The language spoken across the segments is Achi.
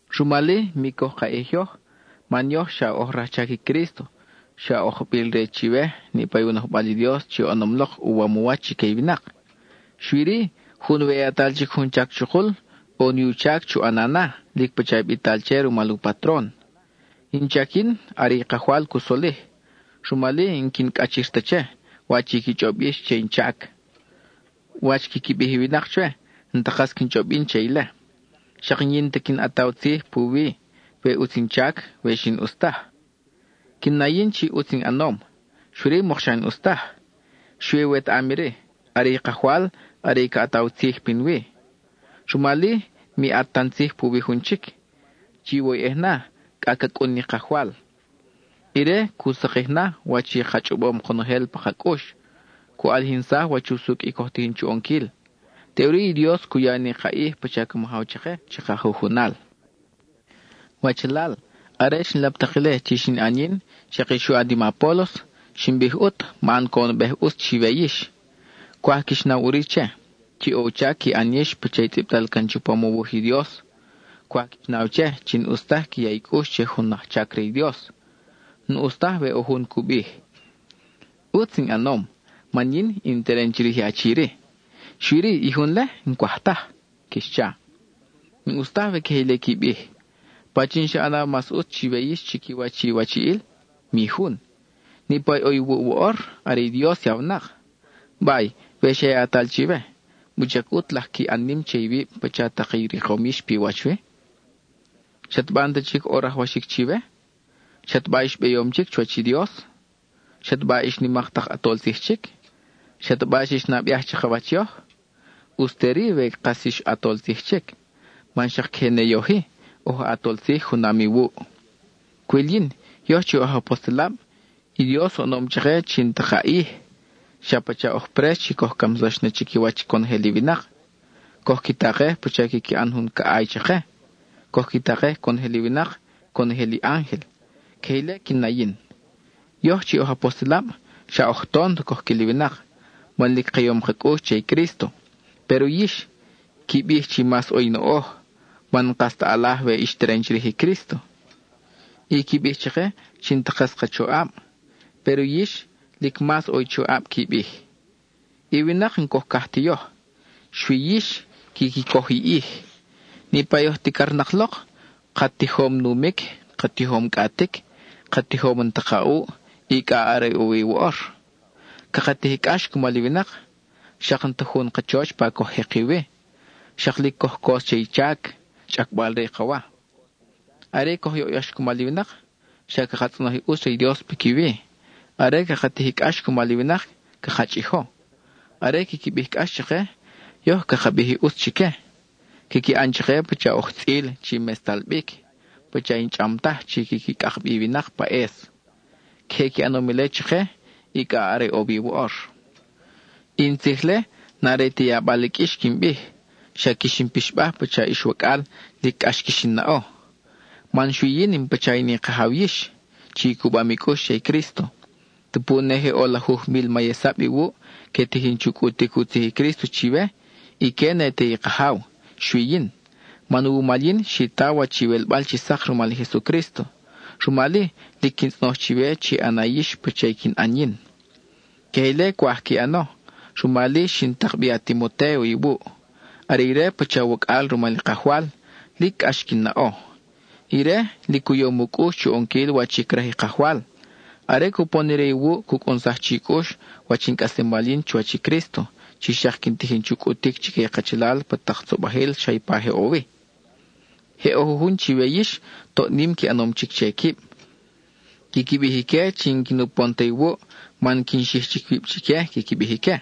Rumal-i, mi coj ka ʼij yoj, man yoj xa oj rajchac i Crísto, xa oj ajbil re chiwe niʼpa i u nojbal i Dios chi oʼonom lok uwam u wach chique i winak. Xui-ri, jun we yatal jun chac chukul, ʼo ni u chac chu ʼana na lic pacha bital che rumal u patron. In chac yin, are i Kajwal cu solij. Rumal-i, n-quin cʼachir ta che, wach i qui chʼob yix che in chac; wach quiqui bij i winak chwe n-ta kas quin chʼob yin che ile. Xak n-yin ta quin ʼataw tzij puwi, we ʼutz in chac, we xi n-ʼus taj. Quin na yin chi ʼutz in ʼanom, xui-ri, mokxa n-ʼus taj. Xui wetaʼam iri, are i Kajwal, are i ca ʼataw tzij pinwi. Rumal-i, mi ʼat tan tzij puwi jun chic; chiwoyʼej na, cʼa ca cʼun ni Kajwal. Ire cu sakij na wach i ka chʼobom konojel pa ka cʼux; cu ʼalijinsaj wach usucʼ i coj tijin chu ʼonquil. Teʼuri i Dios cu ya ni ka ʼij pacha ca majaw chake, chaka jujunal. Wachalal, are xin lap tak ile chi xin ʼan yin, xak i xu ʼan i ma Apólos, xin bij ʼut, man coʼonbej ʼutz chiwe yix. Cwaj quix naw ʼuri che, chi o u chac qui ʼan yix pacha i tzʼibtal can chupam u wuj i Dios. Cwaj quix naw che, chi n-ʼus taj qui ya i cʼux che jun ajchac re i Dios. N-ʼus taj we ʼo jun cu bij: “ʼUtz in ʼanom man yin in teren chirij i achi-ri, xui-ri i jun-le n-cwaj taj,” quix cha. N-ʼus taj we queje ile qui bij. ¿Pachin xa ʼanaw mas ʼutz chiwe yix chiquiwach iwachiʼil? Mi jun. Niʼpa i ʼo iwuʼ woʼor, are i Dios yawnak. Bay, we xa yatal chiwe, ¿wuchac ʼut laj qui ʼan nim che iwib pacha tak i rikom yix pi wach wi? ¿Xataba n-ta chic ʼo rajwaxic chiwe? ¿Xataba ix beyom chic chuwach i Dios? ¿Xataba ix nimak tak ʼatol tzij chic? ¿Xataba xix nabeaj chakawach yoj? ʼUtz te-ri we kas ix ʼatol tzij chic, man xak queje ne yoj-i, oj ʼatol tzij junam iwuʼ. Cwil yin, yoj chi oj apostelab, i Dios oʼonom chake chi n-ta ka ʼij. Xa pacha oj prex chi coj camsax na chiquiwach conojel i winak. Coj qui takej pacha quiqui ʼan jun caʼay chake; coj qui takej conojel i winak, conojel i ángel. Queje ile quin na yin. Yoj chi oj apostelab xa oj tont coj quil i winak, man lic ka yom ka cʼux che i Crísto; péro yix, qui bij chi mas ʼo i noʼoj (man n-kas ta ʼalaj we ix teren chirij i Crísto). Y qui bij chake chi n-ta kas ka choʼab, péro yix, lic mas ʼo i choʼab, qui bij. I winak n-coj caj ti yoj, xui yix quiqui coj i ʼij. Niʼpa oj ticarnak lok, ka tijom numic, ka tijom cʼatic, ka tijom n-ta ka ʼuʼ, y cʼa are ʼo wi woʼor. Caka tij i cʼax cumal i winak; xak n-ta jun kachoch pa coj jeki wi; xak lic coj cos che i chac, chʼacbal-re i ka wa. Are coj yoʼyax cumal i winak, xa caka tzʼonoj i ʼutz re i Dios piquiwi; are caka tij i cʼax cumal i winak, caka chʼijo. Are quiqui bij cʼax chake, yoj caka bij i ʼutz chique. Quiqui ʼan chake pacha oj tzʼil chi mestal bic, pacha i n-chʼam taj chi quiqui cʼak bi i winak pa ʼes. Queje qui ʼanom ile chake, y cʼa are ʼo wi woʼor. I in tzij-le, n-are ti yabal i qʼuix quin bij; xa quix in pixbaj pacha ix wacʼal lic cʼax quix in naʼo. Man xui yin pacha in i kajaw yix, chi i cubam i cʼux che i Crísto. Tupu ne je ʼo lajuj mil mayesab iwuʼ, que tijin chu cʼutic u tzij i Crísto chiwe, ique ne te i kajaw, xui yin, man wumal yin xi ta wach iwelbal chi sak rumal i Jesucrísto. Rumal-i, lic quin tzʼonoj chiwe chi ʼana yix pacha i quin ʼan yin. Queje ile cwaj qui ʼano, rumal-i xin tak bi a-Timotéo iwuʼ. Are ire pacha wacʼal rumal i Kajwal, lic cʼax quin naʼo. Ire, lic u yom u cʼux chu ʼonquil wach i craj i Kajwal. Are cupon ire iwuʼ cu cʼunsaj chi cʼux wach in cʼaslemal yin chuwach i Crísto, chi xak quin tijin chu cʼutic chique i kachalal pa tak tzobajil xa ipa je ʼo wi. Je ʼo jujun chiwe yix, toʼ nim qui ʼanom chic che quib; quiqui bij ique chi n-quin upon ta iwuʼ (man quin xij chic wib chique quiqui bij ique).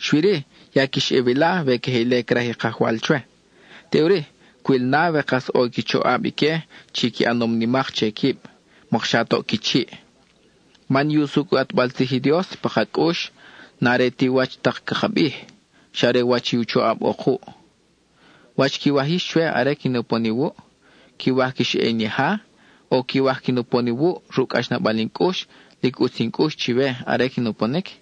Xui-ri, ya quix ʼe wila we queje ile craj i Kajwal chwe. Teʼuri, cwil na we kas ʼo i qui choʼab ique chi qui ʼanom nimak che quib; mokxa toʼ qui chiʼ. Man i usucʼ i u ʼatbal tzij i Dios pa ka cʼux n-are ti wach tak caka bij, xa are wach i choʼab ʼo kuʼ. ¿Wach quiwaj yix chwe are quin upon iwuʼ? ¿Quiwaj quix ʼe in yaja? ¿O quiwaj quin upon iwuʼ ruʼ cʼaxnabal in cʼux, lic ʼutz in cʼux chiwe are quin uponic?